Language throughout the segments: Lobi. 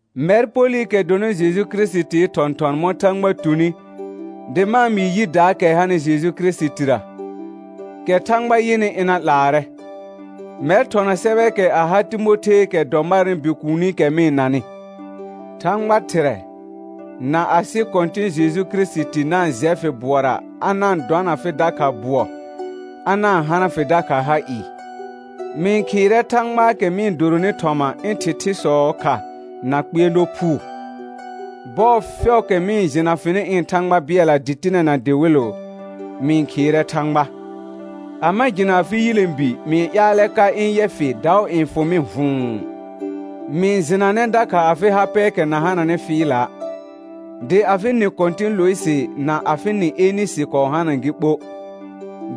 Mɛr Polɩkɛ dɔnɩ Jeju Kirɩsitii thɔ̃thɔn mɔ̃ Thãgba tuni dɩ ma-n mɩɩ yidaakɛ hanɩ Jeju Kirisitira, kɛ Thãgba yɩnɩ ɩna 'laarɛ, mɛr thɔna sɛbɛɛkɛ a ha Timotheekɛ dɔ marnɩ bikuunikɛ mɩ-n nanɩ: Thãgba Thɩrɛ, na asɩ Kɔ̃tɩ̃ Jeju Kirisiti na-n jɛ fɩ bʋɔra a na-n dɔna fɩ dakha bʋɔ, a na-n hana fɩ dakha ha ɩɩ. Mɩ-n khɩɩrɛ Thãgbaakɛ mɩ-n doronɩ thɔma ɩ̃ thɩthɩsɔɔ kha na kpɩɛrnɔ phuu; bɔɔ fɛʋʋkɛ mɩ-n jɩna fɩnɩ ɩ̃ Thãgba bɩɛlla dɩtɩnɛ na dɩwɩlʋ, mɩ-n khɩɩrɛ Thãgba. A ma jɩna afɩ yilẽbi mɩ-n ƴaalɛ ka ɩ̃ yɛ fɩ daʋ n fʋ mɩ vʋ̃ʋ. Mɩ-n jɩnanɛ dakha afɩ ha pɛɛkɛ na hananɩ fɩɩla'; dɩ afɩ nɩ kɔ̃tɩ̃ Lʋɩsɩ na afɩ nɩ Enɩsɩ kɔɔ hana gɩ ɓo,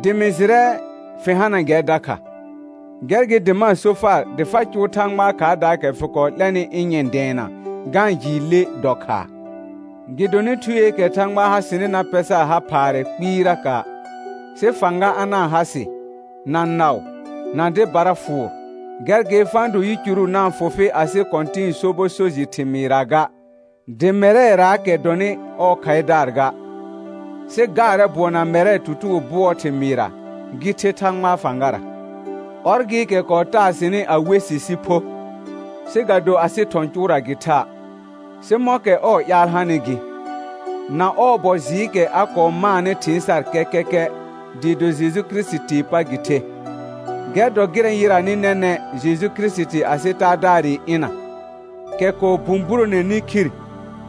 dɩ mɩ jɩrɛ fɩ hana gɛr dakha. Gɛr gɩ dɩ ma-n so far dɩ fa cʋʋ Thãgbaa khaardaakɛ fɩ kɔɔ 'lɛnɩ ɩ̃ nyɛ̃ dɛɛna ga-n jɩɩ le dɔ khaa. Gɩdonɩ Thueekɛ Thãgba ha sɩnɩ na pɛ sar ha phaarɛ kpɩɩraka', sɩ fãga a na-n ha sɩ, na naʋ, na dɩbara fʋʋr. Gɛr gɩ fa-n do yicuru na-n fʋ fɩ asɩ Kɔ̃tɩ̃ɩ sobɔ so jɩ thɩmɩɩra ga, dɩ mɛrɛraakɛ dɔnɩ ɔɔ khaɩdaar ga, sɩ gaarɛ bʋɔ na mɛrɛ tutugo bʋɔɔ thɩmɩɩra, gɩ the Thãgbaa fãgara. Ɔr gɩɩkɛ kɔɔ taa sɩnɩ a we sɩ sɩ pho, sɩ ga do asɩ thɔ̃ cʋʋra gɩ tha', sɩ mɔ̃kɛ ɔɔ ƴaal hanɩ gɩ, na ɔɔ bɔ jɩɩkɛ a kɔɔ maanɩ thɩɩn sar kɛkɛkɛ dɩɩ do Jeju Kirisitii pa gɩ the. Gɛr dɔ gɩrɛ yɩranɩ nɛnɛ̃ Jeju Kirisiti asɩ Taadaarɩ ɩna, kɛ kɔɔ bũburoneni khir,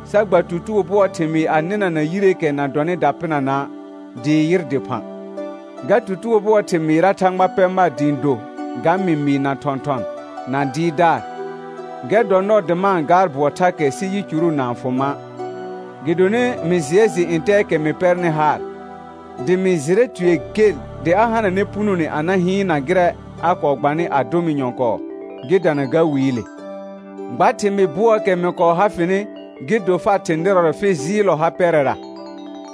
sa gba tutugo bʋɔɔ thɩmɩɩ a nɩnana yireekɛ na dɔnɩ dapɩnana', dɩɩ yɩr dɩphã. Ga tutugo bʋɔɔ thɩmɩɩra Thãgba pɛ mar dɩ ɩ̃ do ga mɩmɩɩ na thɔ̃thɔn na dɩɩrdaar. Gɛr dɔ nɔɔ dɩ ma-n gaar bʋɔ thakɛ sɩ yicuru na-n fʋ ma', gɩdonɩ mɩ jɩɛ jɩ ntɛɛkɛ mɩ pɛrnɩ haar, dɩ mɩ jɩrɛ tue gel dɩ a hananɛ punone a na hɩɩnna gɩrɛ a kɔɔ gbanɩ a dʋ mɩ nyɔ̃kɔɔ gɩ dana ga Wiile. Gba thɩmɩɩ bʋɔɔkɛ mɩ kɔɔ ha fɩnɩ gɩ do far thɩ̃ nɩrɔrɛ fɩ jɩɩllɔ ha pɛrɛra,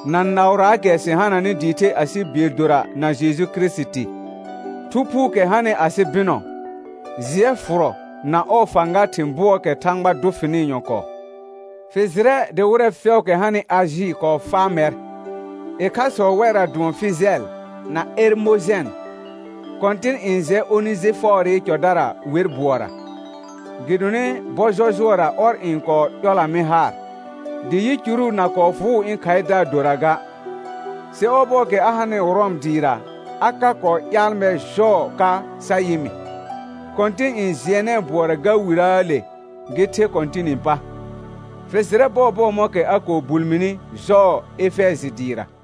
na naʋraakɛ sɩ hananɩ dɩɩ the asɩ bɩɛl dora na Jeju Kirisiti. Thu Phuukɛ hanɩ asɩ bɩnɔ, jɩɛ fʋrɔ na ɔɔ fãga thɩ̃ bʋɔɔkɛ Thãgba dʋ fɩnɩ nyɔ̃kɔɔ. Fɩ jɩrɛ dɩ wɩrɛ fɛʋʋkɛ hanɩ Ajɩ kɔɔ faa mɛr, ɩkhasɔ wɛrra dʋɔn Fɩjɛl na Ɛrmojɛn. Kɔ̃tɩn n jɛ Onejɩfɔɔrɩ cɔdara wer bʋɔra, gɩdonɩ bɔ jɔjʋɔra ɔr n kɔɔ ƴɔla mɩ haar, dɩ yicuru na kɔɔ fʋʋ ɩ̃ khaɩdaar dora ga; sɩ ɔbɔɔkɛ a hanɩ Rɔm dɩɩra a ka kɔɔ ƴaal mɛr jɔɔ ka sa yɩ mɩ. Kɔ̃tɩn n jɩɛnɛɛ bʋɔra ga Wirəəle gɩ the Kɔ̃tɩnɩ pa. Fɩ jɩrɛ bɔɔbɔɔ mɔ̃kɛ a kɔɔ bul mini jɔɔ Efɛjɩ dɩɩra.